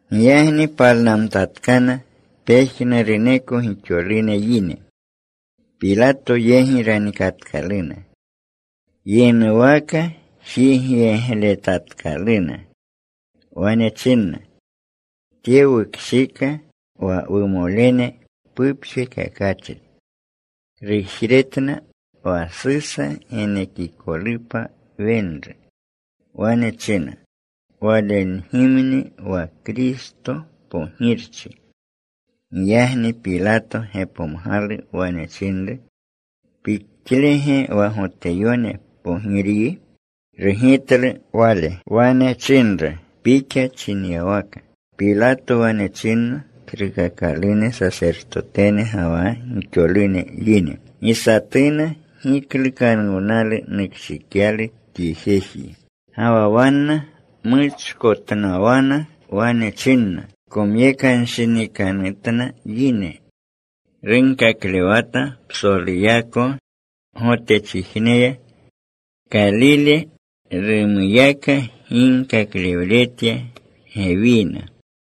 Giyagni palnamtatkana pejnuruneko gixolune yine. Pilato yegi ranikatkaluna. Yinuwaka jigyeglejetatkaluna. Wane chinna, “Tye wukshika wa wumolene pupjekakachri. Rujretna wa Susa genekikolupa wenru. Wane china Walegimni wa Kristo, Pogirchi.” Giyagni Pilato gepomgalu. Wane chinru, “¿Pixnige wa Goteyone Pogiryi?” Rugitlu Wale. Wane chinru, “Pixa chinyawaka.” Pilato wane chinna tsrukakalune sasertotene ga wa gixolune yine, “Gi satuna giklukanuwnalu nukshikyalu tye jeji.” Ga wa wanna muchkotnawana. Wane chinna, “Komyekanshinikanutna yine. Runkaklewata psoluyako Gotechijneya. Kalile rumuyaka ginkaklewletya gewina.”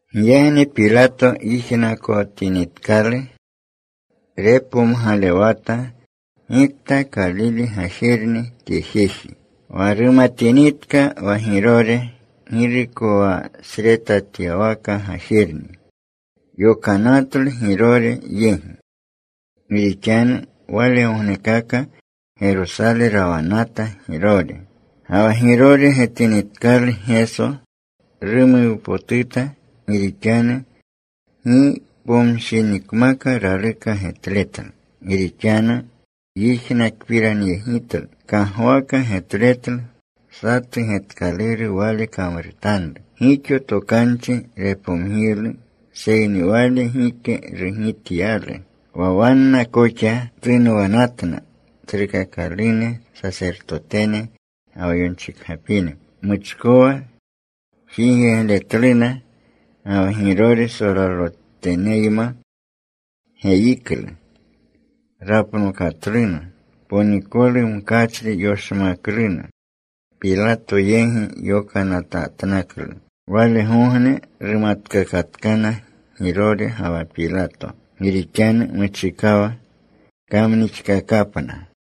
Giyagni Pilato yijnakotinitkalu, repomgalewata gikta Kalile gajerni tye jeji. Wa rumatinitka wa Girore girukowasretatyawaka gajerni, yokanatlu Girore yegi, gi rixanu walegognekaka Gerosale rawanata Girore. Ga wa Girore getinitkalu Geso, rumuwpotuta. Gi rixanu gi pomshinikmaka raluka getletlu. Gi rixanu yijnakpiranyegitlu. Kagwaka getletlu satu getkaluru Wale kamrutanru. Gixo tokanchi repomgiylu, seyni Wale gike rugityalu. Wanna koxa tunwanatna tsrukakalune sasertotene ga wa yonchikgapine. Muchkowa jigyegletluna. Ga wa Girore solaloteneyma geyiklu. Rapnokatluna. Ponikolu mkachri yoshmakluna. Pilato yegi yokanatatnaklu. Walegogne rumatkakatkana Girore ga wa Pilato. Gi rixanu muchikawa kamnixkakapna.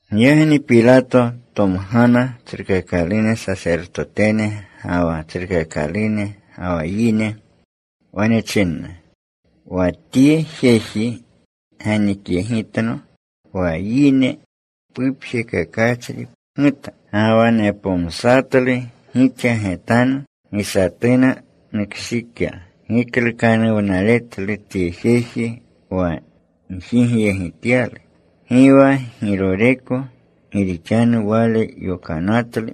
Giyagni Pilato tomgana tsrukakalune sasertotene ga wa tsrukakalune ga wa yine. Wane chinna, “Wa tye jeji ganikyegitno wa yine pupjekakachri pguta. Ga wa nepomsatlu gixa getanu. Gi satuna nukshika giklukanuwnaletlu tye jeji wa gjigyegityalu. Gi wa Giroreko. Gi rixanu wale yokanatlu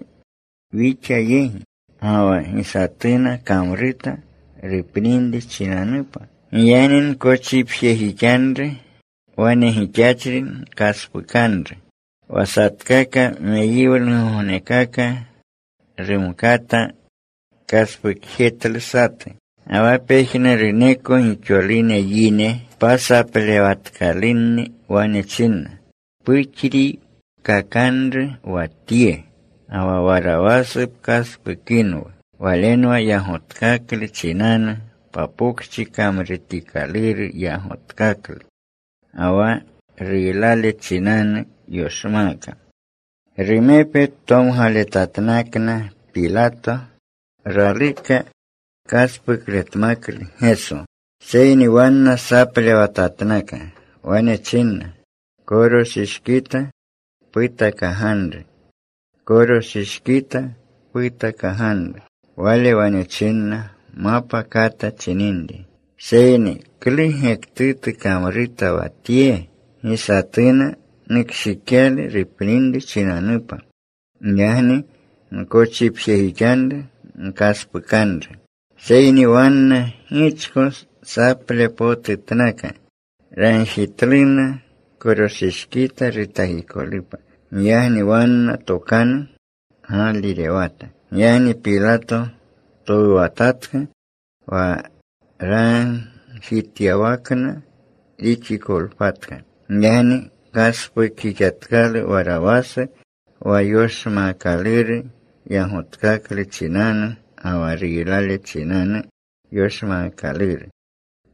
wixa yegi. Ga wa gi satuna kamruta rupninri chinanupa. Giyagni nkochipjejixanru. Wane gixachri nkaspukanru.” Wa satkaka meyiwlugognekaka rumkata kaspuklejetlu satu. Ga wa pejnuruneko gixolune yine pasaplewatkalunni wane chinna, “Puxriikakanru wa Tye. Ga wa Warawasu pkaspukinwu.” Walenwa yagotkaklu chinanu wa pokchi kamrutikaluru yagotkaklu, ga wa ruylale chinanu yoshmaaka. Rumepe tomgaletatnakna Pilato. Raluka kaspukletmaklu Geso. Seyni wanna saplewatatnaka. Wane chinna, “¡Koroshishkita putakaganru! ¡Koroshishkita putakaganru!” Wale wane chinna mapa kata chininri, “Seyni ¿klu gektutu kamruta wa Tye? Gi satuna nukshikyalu rupninri chinanupa. Giyagni nkochipjejixanru. Nkaspukanru.” Seyni wanna gichko saplewlepotutatnaka. Ragjitluna koroshishkita rutakikolupa. Giyagni wanna tokanu gaalirewata. Giyagni Pilato towuwatatka wa ragjityawakna rixikolpatka. Giyagni kaspukjixatkalu Warawasu wa yoshmaakaluru, yagotkaklu chinanu ga wa ruylale chinanu yoshmaakaluru,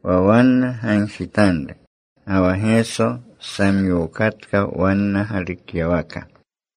wa wanna gagjitanru. Ga wa Geso samyokatka wanna galukyawaka.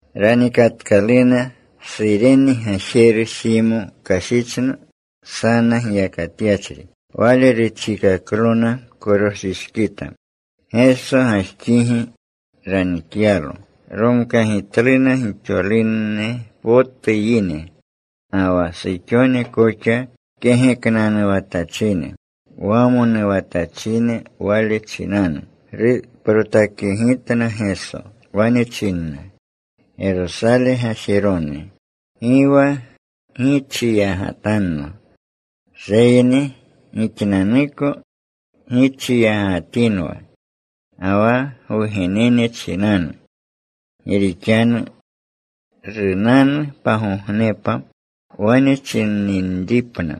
Ranikatkaluna. Surene gajeru Simo kashichna, sana giyakatyachri. Wale rutjikaklona koroshishkita, Geso gajxigi ranikyaplo. Romkagitluna gixolune potu yine, ga wa suxone koxa, kegeknanuwatachine, wamonuwatachine Wale chinanu. Ruprotakyegitna Geso. Wane chinna, “Gerosale gajerone, gi wa gichiyagatanno. Seyni gixnanuko gichiyagatinwa, ga wa gwugenene chinanu. Gi rixanu runanu pagognepa, wane chininripna,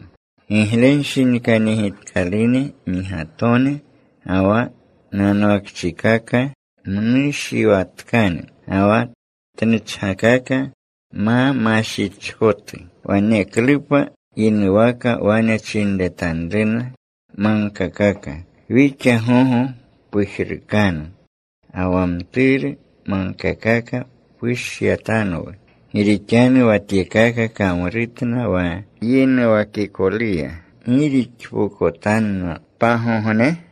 ‘Giglenshinikanyegitkalune migatone, ga wa nanwakchikaka mmushiwatkane, ga wa tnuchkaka ma mashichkotu.’ Waneklupa yinuwaka wane chinretanruna magkakaka: Wixa gogo pujrukanu. Ga wa mturu magkakaka: Pushyatanwu. Gi rixanu wa tyekaka kamrutna wa yinuwakikoluya, ¿gi rixpokotanna pagogne?”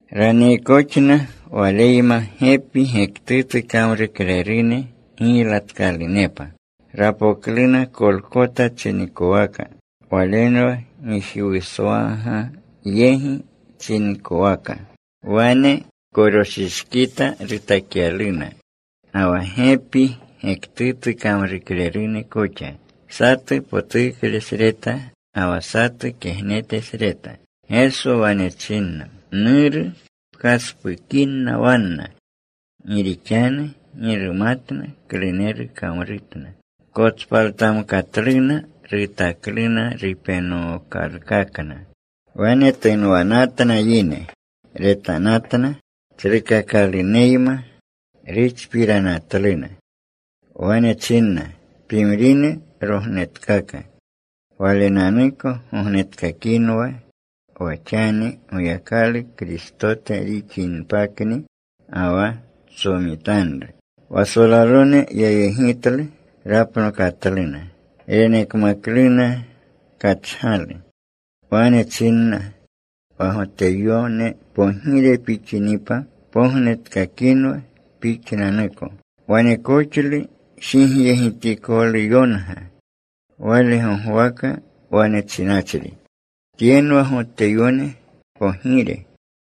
Raniikakoxna Waleyma gepi gektutu kamruklerune giylatkalunepa. Rapokluna Kolkota chinikowaka. Walenwa Gijiwuswaga yegi chinikowaka. Wane koroshishkita rutakyaluna, ga wa gepi gektutu kamruklerune koxa, satu potuklesreta, ga wa satu kegnetesreta. Geso wane china, “Nuru, pkaspukinna wanna. Gi rixanu gi rumatna kluneru kamrutna.” Kotspaltamkatluna. Rutakluna rupenokalkakna. Wane tunwanatna yine. Retanatna. Tsrukakaluneyma ruxpiranatluna. Wane chinna, “Pimrine rognetkaka. Walenanuko gognetkakinwa wa xani Goyakalu Kristote rixinpakni, ga wa tsomitanru.” Wa solalone yayegitlu. Rapnokatluna. Renekmakluna kachgalu. Wane chinna, “Wa Goteyone pogire pixinipa, pognetkakinwa Pixnanuko.” Wanekoxlu jigyegitikoluyonga Wale gogwaka wane chinachri: Tyenwa Goteyone Pogire.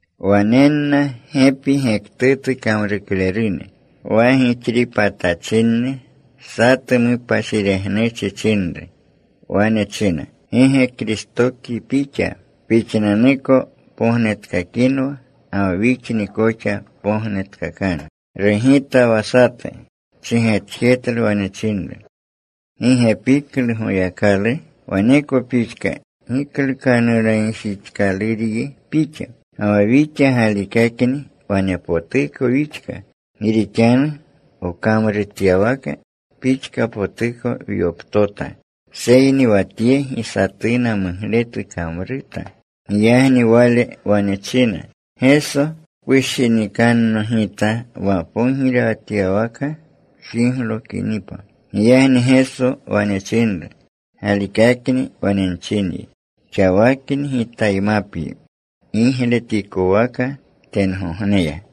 Wanenna gepi gektutu kamruklerune, wa gixripatachinni. Satu mupashiregnuchi chinru. Wane china, “¿Gi ge Kristokyi pixa? Pixnanuko pognetkakinwa ga wa wixni koxa gognetkakanu.” Rugita wa satu. Chigetjetlu. Wane chinru, “¿Gi ge piklu Goyakalu? Waneko pixka giklukanuwnayegjixkaluryi pixa. Ga wa wixa galikakni wanepotuko wixka. Gi rixanu wkamrutyawaka pixkapotuko wyoptota. Seyni wa Tye gi satuna mugletu kamruta.” Giyagni wale wane china, “Geso, pushinikanno gita wa pogirewatyawaka pjiglokinipa.” Giyagni Geso wane chinru, “Galikakni wane nchinyi, xawakni Gitaymapyi gigletikowaka tengogneya.”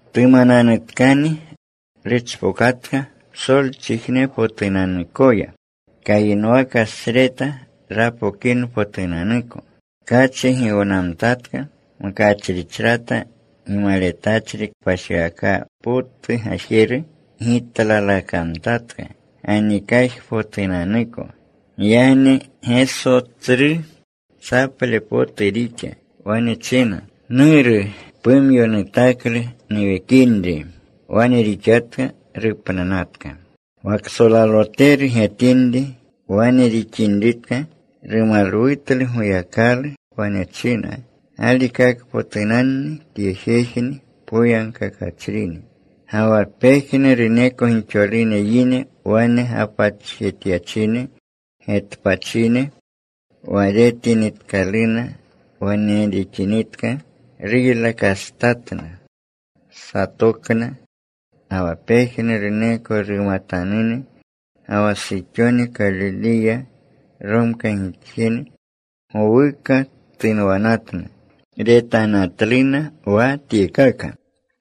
Tumananutkani ruchpokatka psolchijnepotunanuyako, kayinwakasreta rapokinpotunanuko. Tkachi giwnamtatka. Mkachrichrata gimaletachri kpashiwaka potu gajeru gitlalakamtatka ganikajpotunanuko. Giyagni Geso tsru saple potu rixa. Wane china, “Nuru, pumyo nutaklu nuwekinri.” Wane rixatka, rupnanatka. Wa ksolaloteru getinri wane rixinritka, rumalwutlu Goyakalu. Wane china, “Galikakpotunanni tye jejni poyagkakachrini.” Ga wa pejnuruneko gixolune yine wane gapatjetyachine getpachine, wa retinitkaluna wane rixinitka, ruylakastatna. Satokna. Ga wa pejnuruneko rumatanune ga wa suxone, Kalileya romkagitjene, gowuka tunwanatna. Retanatluna wa tyekaka.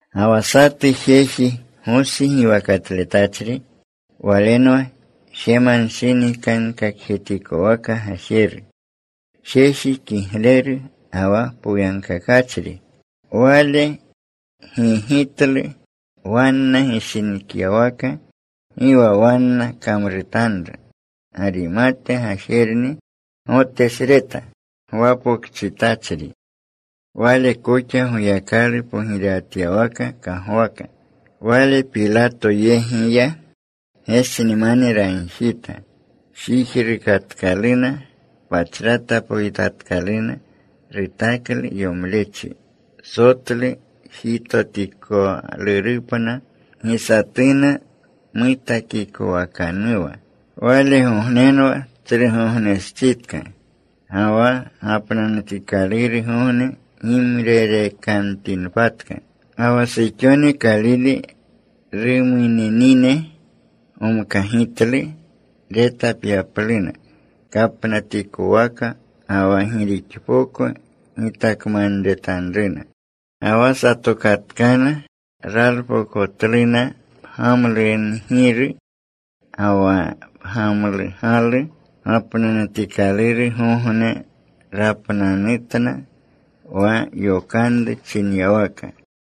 Ga wa satu jeji Gosi giwakatletachri. Walenwa jemanshinikankakjetikowaka gajeru, jeji kigleru ga wa poyagkakachri. Wale gi gigitlu wanna gishinikyawaka, gi wa wanna kamrutanru. Garimate gajerni, Gotesreta gwapokchitachri. Wale koxa Goyakalu pogirewatyawaka kagwaka. Wale Pilato yegi ya. Gesnimane ragjita. Jijrukatkalu. Pachrata poyitatkalu. Rutaklu yomlechi sotlu jitotikalurupna, gi satuna mutakikowakanuwa. Walegognenwa Tsrugognestsitka. Ga wa gapnanutikalurgogne gimrerekamtinpatka. Ga wa suxone, Kalile rumuninine, gomkagitlu retapyapluna kapnatikowaka, ga wa gi rixpoko gitakamanretanruna. Ga wa satokatkana. Ralpokotluna pgamlungiru ga wa pgamlugalu. Gapnanutikalurgogne rapnanutna wa yokanru chinyawaka.